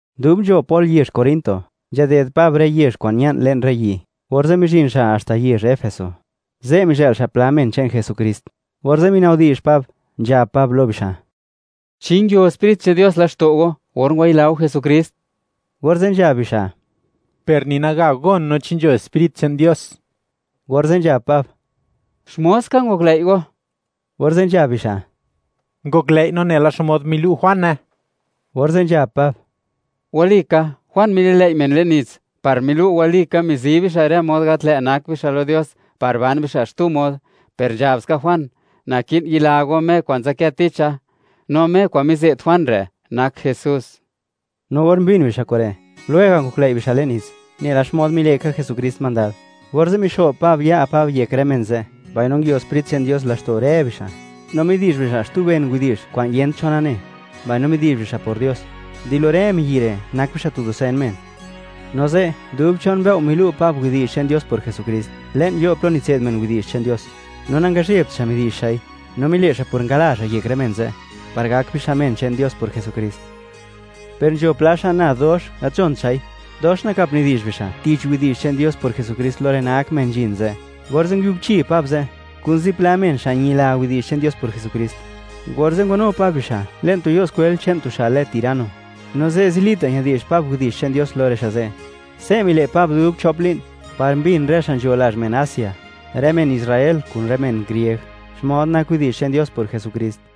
Dub nzho Pol yezh Corinto, nzhaded Pab rë yezh kwa'n ña'n le'n rë yi', orze' mizhin xa' haxta yezh Efeso. Ze' mizhë'l xa' pla men che'n Jesukrist, orze' minabdi'zh Pab, nzhab Pab lo bixa': ―¿Chi nguio Sprit che'n Dios laxto' go, or ngwayila go Jesukrist? Orze' nzhab bixa': ―Per ni naga gon no chi nzho Sprit che'n Dios. Orze' nzhab Pab: ―¿Xmod ska ngoklëi' go? Orze' nzhab bixa': ―Ngoklëi' no nela xmod milu' Juane. Orze' nzhab Pab: ―Walika, Juan mililëi' men le'n nits, par milu' walika mizi bixa' rë mod gat lë' nak bixa' lo Dios par ban bixa' xtu mod; per nzhab ska Juan: “Naki'n yila go Me kwa'n nzadkë ticha.” No Me kwa'n mize't Juan re', nak Jesús. No or mbin bixa' kure', lwega' ngoklëi' bixa' le'n nits, nela xmod mile' ka Jesukrist mandad, orze' mixo'b Pab ya' Pab yek rë men ze', mbaino nguio Sprit che'n Dios laxto' rë bixa', no midi'zh bixa' xtu ben widi'zh kwa'n yent cho nane, mbaino midi'zh bixa' por Dios. Di lo rë miyi' re', nak bixa' tu dusen men. No ze', dub chon mbëo' milu' Pab widi'zh che'n Dios por Jesukrist le'n yo' plo nitse'd men widi'zh che'n Dios, no nangazhebt xa' midi'zh xa'i, no mile' xa' por ngala xa' yek rë men ze', par gak bixa' men che'n Dios por Jesukrist. Per nzho pla xa' nad dox, gat nzhont xa'i, dox nakap nidi'zh bixa' tich widi'zh che'n Dios por Jesukrist lo rë nak men nzhin ze'. Orze' nguiubchi Pab ze', kun zipla men xa' ñila widi'zh che'n Dios por Jesukrist, orze' ngwanu Pab bixa' le'n tu yo' skwel che'n tu xa' lë Tirano, no ze', zilita' ñadi'zh Pab widi'zh che'n Dios lo rë xa' ze'. Se' mile' Pab dub chop li'n, par mbin rë xa' nzho lazh men Asia, rë men Israel kun rë men grieg, xmod nak widi'zh che'n Dios por Jesukrist.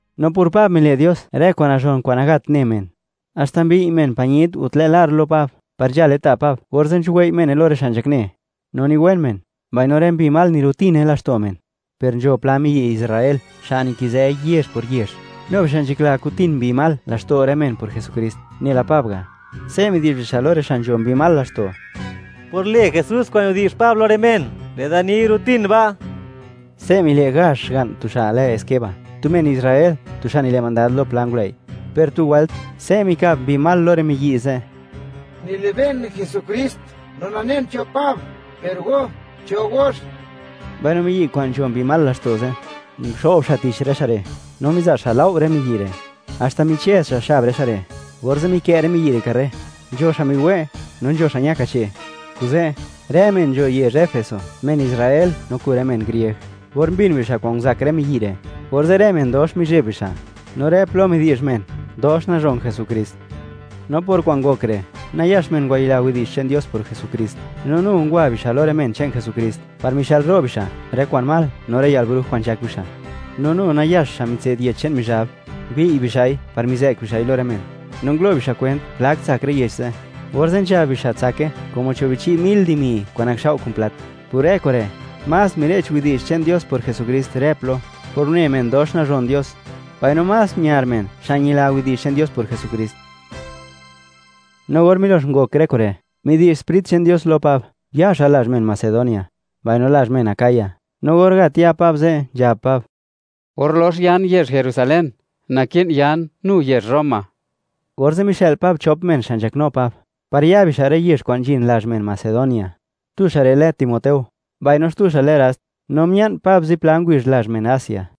No por Pab, mile' Dios rë kwa'n nazhon kwa'n nagat ne men. Haxta mbiy' men pañit o tlë' lar lo Pab par nzhale ta' Pab, orze' nzhuwei' mene lo rë xa' nzhakne, no niwen men, mbaino rë mbi mal nirutine laxto' men. Per nzho pla miyi' Israel, xa' nikizë yezh por yezh, nu bixa' nzhakla kutin mbi mal laxto' rë men por lë Jesukrist, nela Pab ga'. Se' midi'zh bixa' lo rë xa' nzho mbi mal laxto': ―Por lë Jesús kwa'n nidi'zh Pab lo rë men, lë'da ni, ¡guro'tin ba'! Se' mile' gazh xga'n tu xa' lë Esceva, tu men Israel, tu xa' nile' mandad lo pla ngulëi'. Per tu wëlt, se' mikab mbi mal lo rë miyi' ze': ―Nilibe'n Jesukrist no nanen cho Pab, per go, ¿cho gox? Mbaino miyi' kwa'n nzho mbi mal laxto' ze', nguxo'b xa' tich rë xa' re', no miza' xa' lao' rë miyi' re', haxta michëz xa' xab rë xa' re', orze' mikë' rë miyi' re' karre; nzho xa' miwe', no nzho xa' ña kache'. Kuze', rë men nzho yezh Efeso, men Israel no kun rë men grieg, or mbin bixa' kwan nguzak rë miyi' re', orze' rë men dox mizheb bixa', no rë plo midi'zh men: “Dox nazhon Jesukrist.” No por kwa'n ngok re', nayax men ngwayila widi'zh che'n Dios por Jesukrist, no nu ngwa bixa' lo rë men che'n Jesukrist par mixëlro' bixa' rë kwa'n mal no rë yalbruj kwa'n nzhak bixa'. No nu nayax xa' mitse'd yech che'n Mizhab, mbiy' bixa'i par mizë'k bixa'i lo rë men. No ngulo' bixa' kwent plak tsak rë yech ze', orze' nzhab bixa' tsake como cho' bi chi' mil dimi kwa'n nakxao' kun plat. Por rë kure', más mire'ch widi'zh che'n Dios por Jesukrist rë plo, por une men dox nazhon Dios, mbaino más miar men xa' ñila widi'zh che'n Dios por Jesukrist. No or milox ngok rë kure', midi'zh Sprit che'n Dios lo Pab, ya xa' lazh men Macedonia, mbaino lazh men Acaya. No or gat ya Pab ze', nzhab Pab: —Or lox yan yezh Jerusalén, naki'n yan, nu yezh Roma. Orze' mixë'l Pab chop men xa' nzhaknu Pab, par ya bixa' rë yezh kwa'n nzhin lazh men Macedonia. Tu xa' re' lë Timoteo, mbaino xtu xa' lë Rast. No mia'n Pab zipla ngubizh lazh men Asia.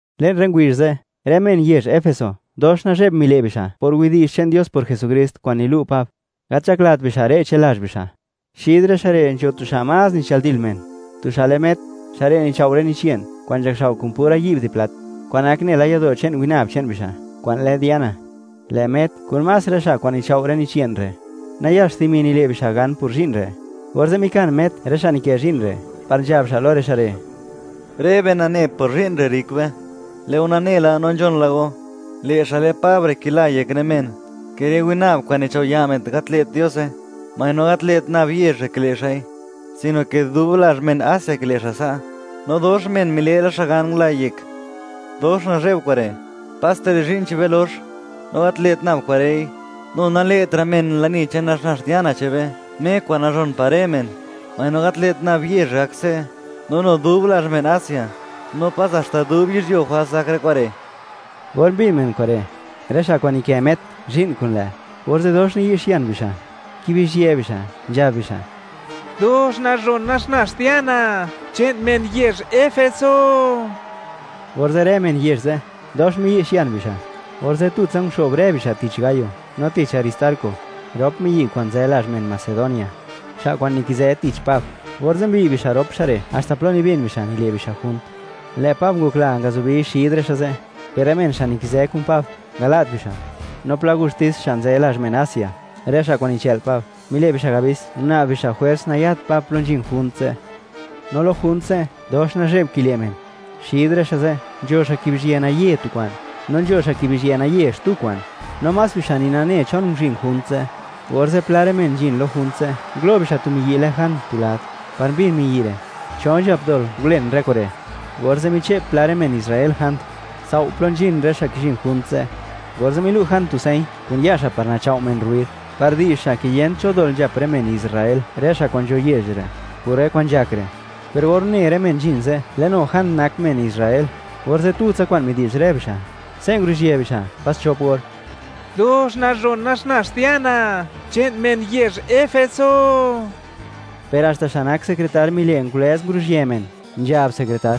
Le'n rë ngubizh ze', rë men yezh Efeso, dox nazheb mile' bixa' por widi'zh che'n Dios por Jesukrist kwa'n nilu' Pab, gat nzhaklat bixa' re'che lazh bixa'. Xid rë xa' re' nzho tu xa' más nichëldil men, tu xa' lë Met. Xa' re' nichao' rë nich ye'n kwa'n nakxao' kun pura yi'b de plat, kwa'n nak nela yado' che'n winab che'n bixa' kwa'n lë Diana. Lë' Met kun más rë xa' kwa'n nichao' rë nich ye'n re', nayax dimi nile' bixa' gan por zhi'n re'. Orze' mikan Met rë xa' nikë zhi'n re', par nzhab xa' lo rë xa' re': ―Rë be nane, por zhi'n re', rrik be. Lë' go nane la, no nzhon la go, lë' xa' lë Pab re' kila yek rë men, ke rë winab kwa'n nichao' ya' men, gat lë't Diose. Mbaino gat lë't nab yezh re' kile' xa'i, sino ke dub lazh men Asia kile' xa' sa'. No dox men mile' la xa' gan ngula yek. Dox nazhe'b kure'. Paste lë' zhi'n che'n be lox. No gat lë't nab kure'i, nu nale'tra' men lani che'n naxnax Diana che'n be, Me kwa'n nazhon par rë men. ¡Mbaino, gat lë't nab yezh re' gake se', no nu dub lazh men Asia, no pas haxta dub yizhyuo jwals gak rë kure'! Or mbin men kure', rë xa' kwa'n nikë Met zhi'n kun lë', orze' dox niyi'xian bixa', kibizhië bixa', nzhab bixa': ―¡Dox nazhon naxnax Diana che'n men yezh Efeso! Orze' rë men yezh ze', dox miyi'xian bixa'; orze' tutsa nguxo'b rë bixa' tich Gayo no tich Aristarco, rop miyi' kwa'n nzë lazh men Macedonia, xa' kwa'n nikizë tich Pab; orze' mbiy' bixa' rop xa' re', haxta plo nibin bixa', nile' bixa' junt. Lë' Pab ngokla ngazubi xid rë xa' ze', per rë men xa' nikizë kun Pab, ngala't bixa'. No pla gustis, xa' nzë lazh men Asia, rë xa' kwa'n nichë'l Pab, mile' bixa' abis, guna'b bixa' jwers nayat Pab plo nzhin junt ze'. No lo junt ze', dox nazhe'b kile' men. Xid rë xa' ze', nzho xa' kibizhië naye tu kwa'n, no nzho xa' kibizhië naye xtu kwa'n, no más bixa' ni nane chon nguzhin junt ze'. Orze', pla rë men nzhin lo junt ze', ngulo' bixa' tu miyi' lë Jand tu lad, par mbin miyi' re', cho nzhap dol ngulen rë kure'; orze' miche'p pla rë men Israel Jand, tsao' plo nzhin rë xa' kizhin junt ze'. Orze' milu' Jand tu señ kun ya' xa' par nachao' men rruid, par di'zh xa' ke yent cho dol nzhap rë men Israel, rë xa' kwa'n nzho yezh re', por rë kwa'n nzhak re'. Per or une rë men nzhin ze', lë' nu Jand nak men Israel, orze' tutsa kwa'n midi'zh rë bixa', se' nguruzhië bixa' pas chop or: ―¡Dox nazhon naxnax Diana che'n men yezh Efeso! Per haxta xa' nak sekretar mile' ngulëz nguruzhië men, nzhab sekretar: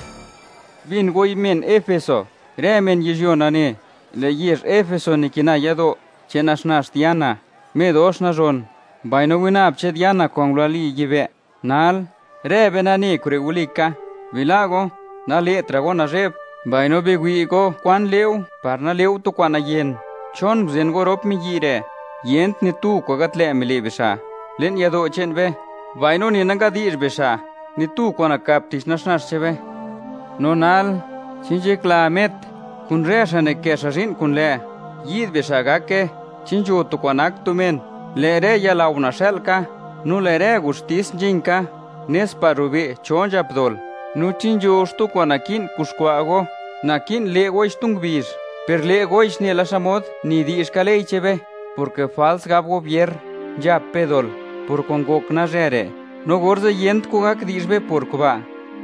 ―Bin goi men Efeso, rë men yizhyuo nane, lë' yezh Efeso nikina yado' che'n naxnax Diana, me dox nazhon, mbaino winab che'n Diana kwa'n ngulali yibë'. Nal, rë be nane, kure' walika. Bila' go, nale'tra' go nazhe'b, mbaino biwi' go kwan le'u, par nale'u tu kwa'n nayen. ¿Chon nguzen go rop miyi' re'? Yent ni tu kwa'n gat lë' mile' bixa' le'n yado' che'n be, mbaino ni nangadi'zh bixa' ni tu kwa'n nakap tich naxnax che'n be. No nal, chi nzhakla Met, kun rë xa' nikë xa' zhi'n kun lë', yi'd bixa' gake, chi nzho tu kwa'n nak tu men, lë' rë yalao naxa'l ka, no lë' rë gustis nzhin ka, nes par rube' cho nzhap dol. No chi nzho xtu kwa'n naki'n kuxkwa' go, naki'n le' goi xtu ngubizh, per le' goix nela xmod nidi'zhka ley che'n be, porke jwals gab gobier, nzhap be dol por kwa'n ngok nalzhë re', no orze' yent kwan gak di'zh be por kuba'.